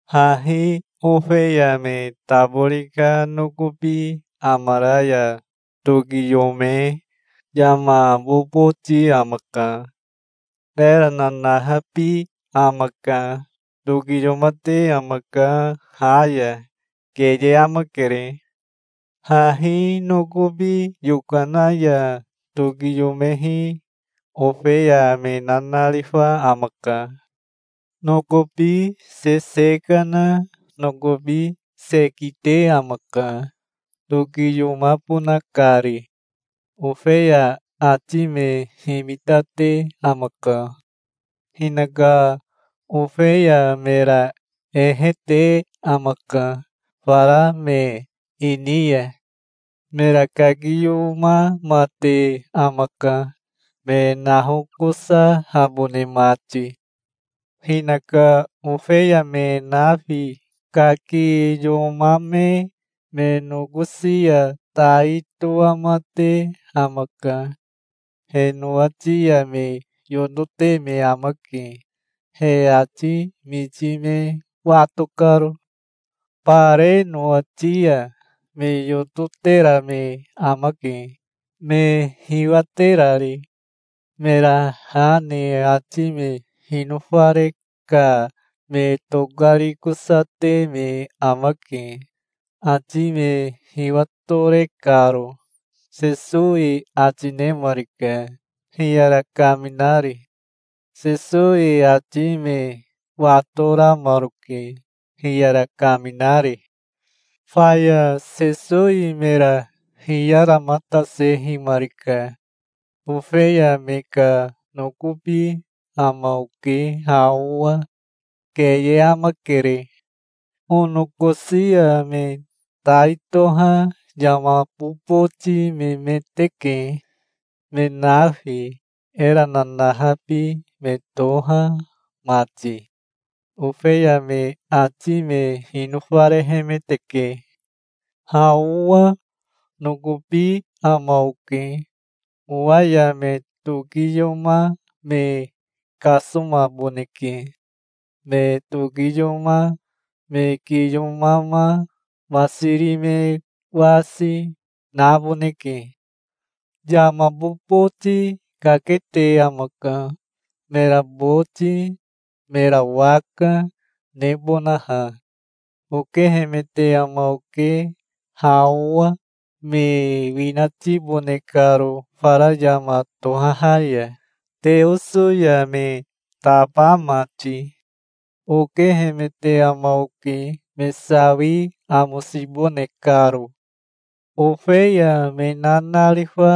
"Hahi ofeya me tabori ka nokobi amara ya tokiyome yama boboti amaka. Era nanahabi amaka. Tokiyomate amaka ha ya. Keye amakere. Hahi nokobi yokana ya tokiyomehi ofeya me nanarifa amaka. Nokobi sese kana nokobi se kite amaka, tokiyomabona kari. Ofeya ati me himitate amaka. Hinaka ofeya mera ehe te amaka fara me ini ya. Mera kakiyomamate amaka, me nahokosahabone mati. Hinaka ofeya me nafi kakiyomame me nokosi ya tai toamate amaka. He nowati ya me yotote me amake, he ati miti me wato karo. Bare nowati ya me yototera me amake, me hiwaterari. Mera ha ne ati me hinofare ka me tokarikosate me amake, ati me hiwatore karo", Sesowi ati nemarika, hiyara kaminari. Sesowi ati me watoramaroke, hiyara kaminari. Faya Sesowi mera hiyaramatasehimarika. "Ofeya me ka nokobi ama oke ha owa. Keye amakere. Onokosi ya me tai toha yama boboti memeteke, me nafi, era nanahabi me toha mati. Ofeya me ati me hinofarehemeteke. Ha owa nokobi ama oke. Owa ya me tokiyoma me kasomaboneke. Me tokiyoma, me kiyomama, masiri me wasi, naboneke. Yama boboti kakete amaka, mera boti, mera waka, nebonaha. Okehemete ama oke ha owa, me winatibone karo fara yama tohaha ya, Teoso ya me taba mati. Okehemete ama oke me sawi amosibone karo". "Ofeya me nanarifa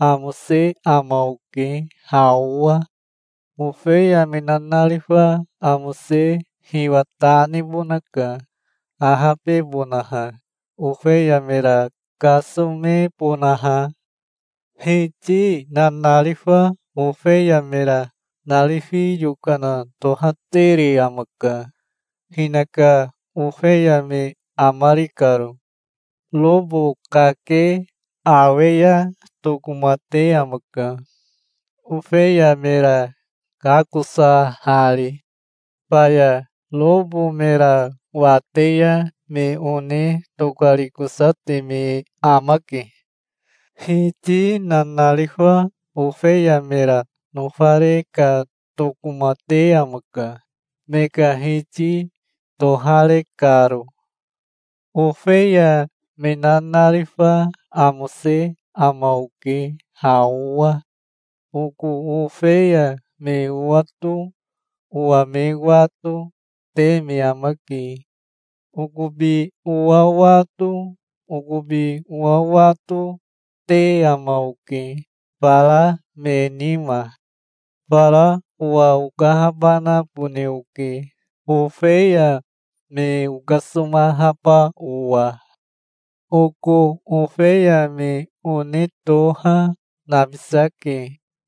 amose ama oke ha owa. Ofeya me nanarifa amose hiwa ta nebonaka, ahabebonaha, ofeya mera kasomebonaha. Hiti nanarifa ofeya mera narifi yokana tohatere amaka, hinaka ofeya me amari karo. Robo kake awe ya tokomate amaka, ofeya mera kakosahari. Faya robo mera wate ya me one tokarikosate me amake. Hiti nanarifa ofeya mera nofare ka tokomate amaka, me ka hiti tohare karo. Ofeya me nanarifa amose ama oke ha owa. Oko ofeya me owato, owa me wato, te me amake. Okobi owa wato, okobi owato, te ama oke, fara me nima. Fara owa okahabanabone oke, ofeya me okasomahaba owa". "Oko ofeya me one toha, nabisake,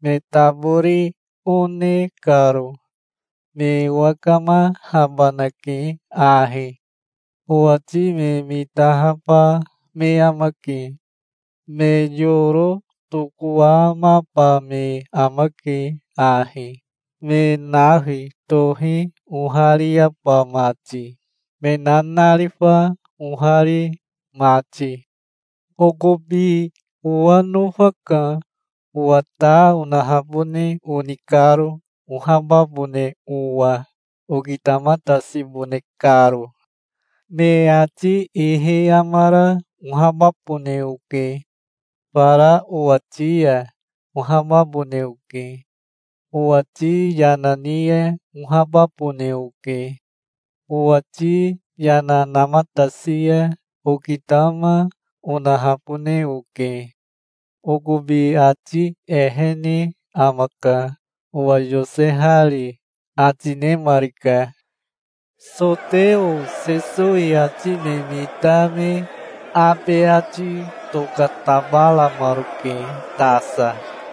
me tabori one karo. Me owakamahabanake ahi. Owati me mitahaba me amake. Me yoro tokowamaba me amake ahi, me nafi tohi ohariaba mati, me nanarifa ohari mati". "Okobi owa nofaka, owa ta onahabone oni karo ohababone owa, okitamatasibone karo. Me ati ihi amara ohababone oke. Fara owati ya ohababone oke. Owati yana ni ya ohababone oke. Owati yana namatasi ya okitama onahabone oke. Okobi ati ehene amaka, owa yosehari", ati nemarika. Soteo Sesowi ati me mita me abe ati tokatabaramaroke tasa.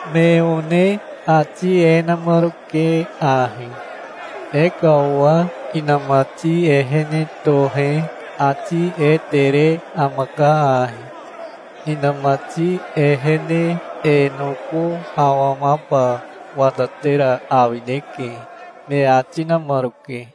Me one ati e namaroke ahi: "E ka owa inamati ehene tohe ati e tere amaka ahi. Inamati ehene e noko awamaba watatera awineke", me ati namaroke.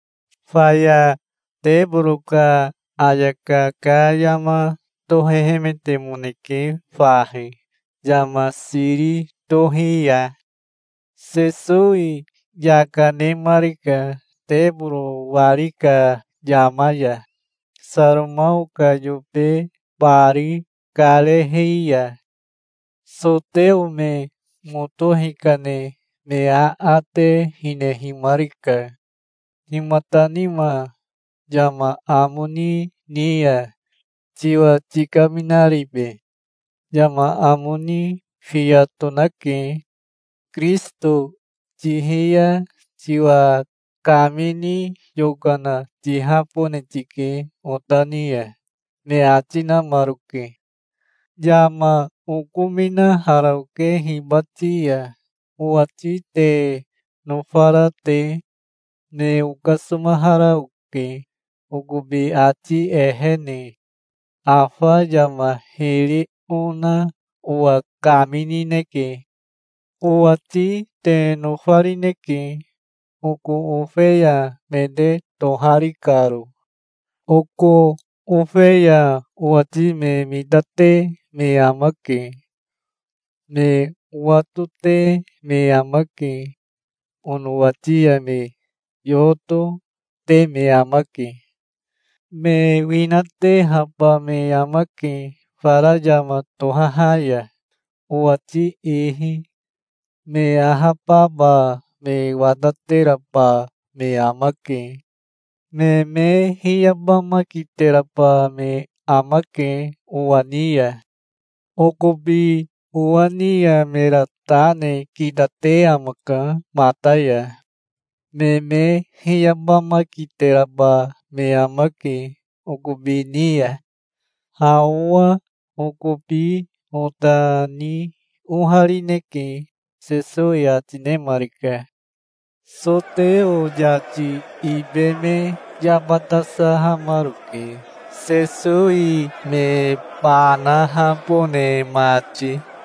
Faya teboro ka ayaka ka yama tohehemetemoneke fahi, yama siri tohi ya. Sesowi yaka nemarika teboro wari ka yama ya, Saromao ka yobe bari karehi ya. Soteo me moto hikane me aate hinehimarika. "Himata nima yama amo ni ni ya tiwa tikaminaribe? Yama amo ni fiya tonake. Kirisito tihi ya tiwa kamini yokana tihahabone tike ota ni ya", me ati namaroke. "Yama okominahara oke hibati ya, owati te nofara te. Me okasomahara oke, okobi ati ehene. Afa yama hiri ona owa kaminineke. Owati te nofarineke, oko ofeya me te tohari karo. Oko ofeya owati me mitate me amake. Me owatote me amake. Onowati ya me yoto, te me amake. Me winatehaba me amake fara yama tohaha ya, owati ihi. Me ahababa me watateraba me amake. Me me hiyabamakiteraba me amake owa ni ya. Okobi owa ni ya mera ta ne kitate amaka mata ya. Me me hiyabamakiteraba me amake okobi ni ya. Ha owa okobi ota ni oharineke", Sesowi ati nemarika. Soteo yati ibe me yabatasahamaroke, Sesowi me banahabone mati, ahabebonaha.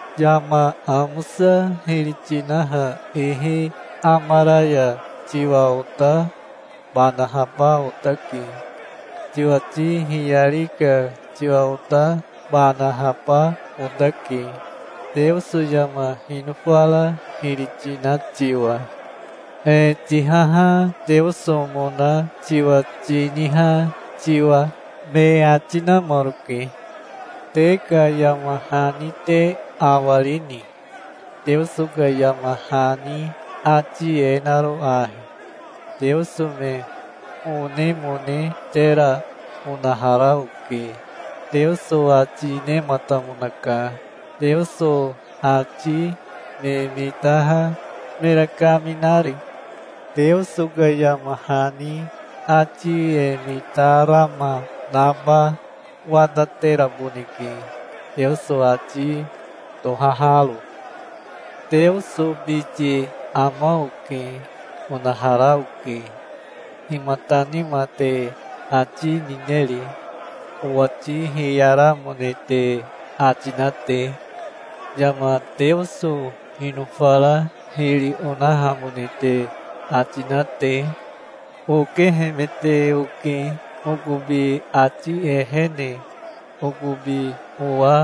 "Yama amosa hiri tinaha ihi amara ya tiwa ota banahaba otake. Tiwati hiyari ka tiwa ota banahaba otake, Teoso yama hinofara hiri tina tiwa, e tihaha Teosomona tiwa tiniha tiwa", me ati namaroke. "Te ka yama hani te awarini, Teoso ka yama hani, ati e naro ahi: 'Teoso me onemone tera onahara oke', Teoso ati nematamonaka, Teoso ati me mitaha mera kaminari. Teoso ka yama hani ati e mitarama naba watateraboneke, Teoso ati tohaharo. Teoso biti ama oke, onahara oke. Himata nima te ati nineri, owati hiyaramone te ati na te, yama Teoso hinofara hiri onahamone te ati na te? Okehemete oke okobi ati ehene, okobi owa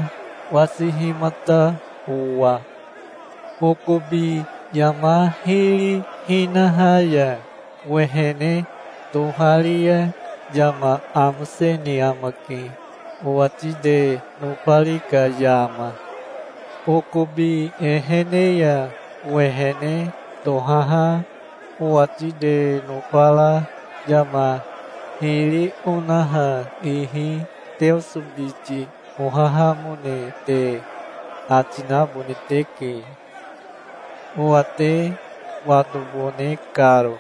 wasihimata owa. Okobi yama hiri hinaha ya owehene tohari ya yama amosene amake owati te nofari ka yama. Okobi ehene ya owehene tohaha owati te nofara yama hiri onaha ihi Teoso biti ohahamone te ati nabone teke, owa te watobone karo,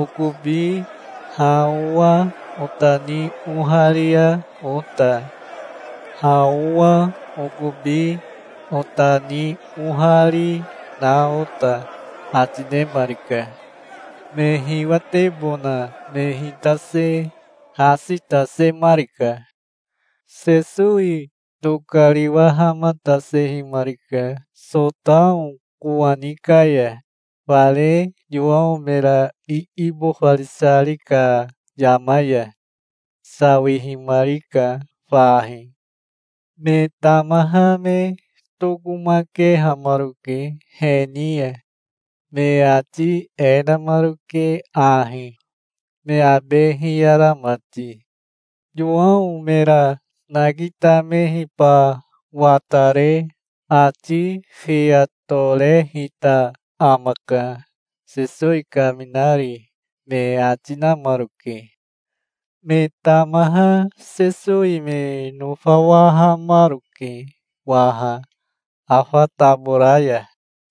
okobi ha owa ota ni oharia ota, ha owa okobi ota ni ohari na ota", ati nemarika. Me hiwatebona me hitase hasi tasemarika. Sesowi tokariwahamatasehimarika Sotao kowani ka ya, fare Yowao mera iibofarisari ka yama ya. Sawihimarika fahi. Me tamaha me tokomakehamaroke he ni ya. Me ati e namaroke ahi, me abe hiyara mati: "Yowao mera nakitamehiba watare ati fiya torehita amaka, Sesowi kaminari", me ati namaroke. Me tamaha Sesowi me nofawahamaroke waha afa tabora ya.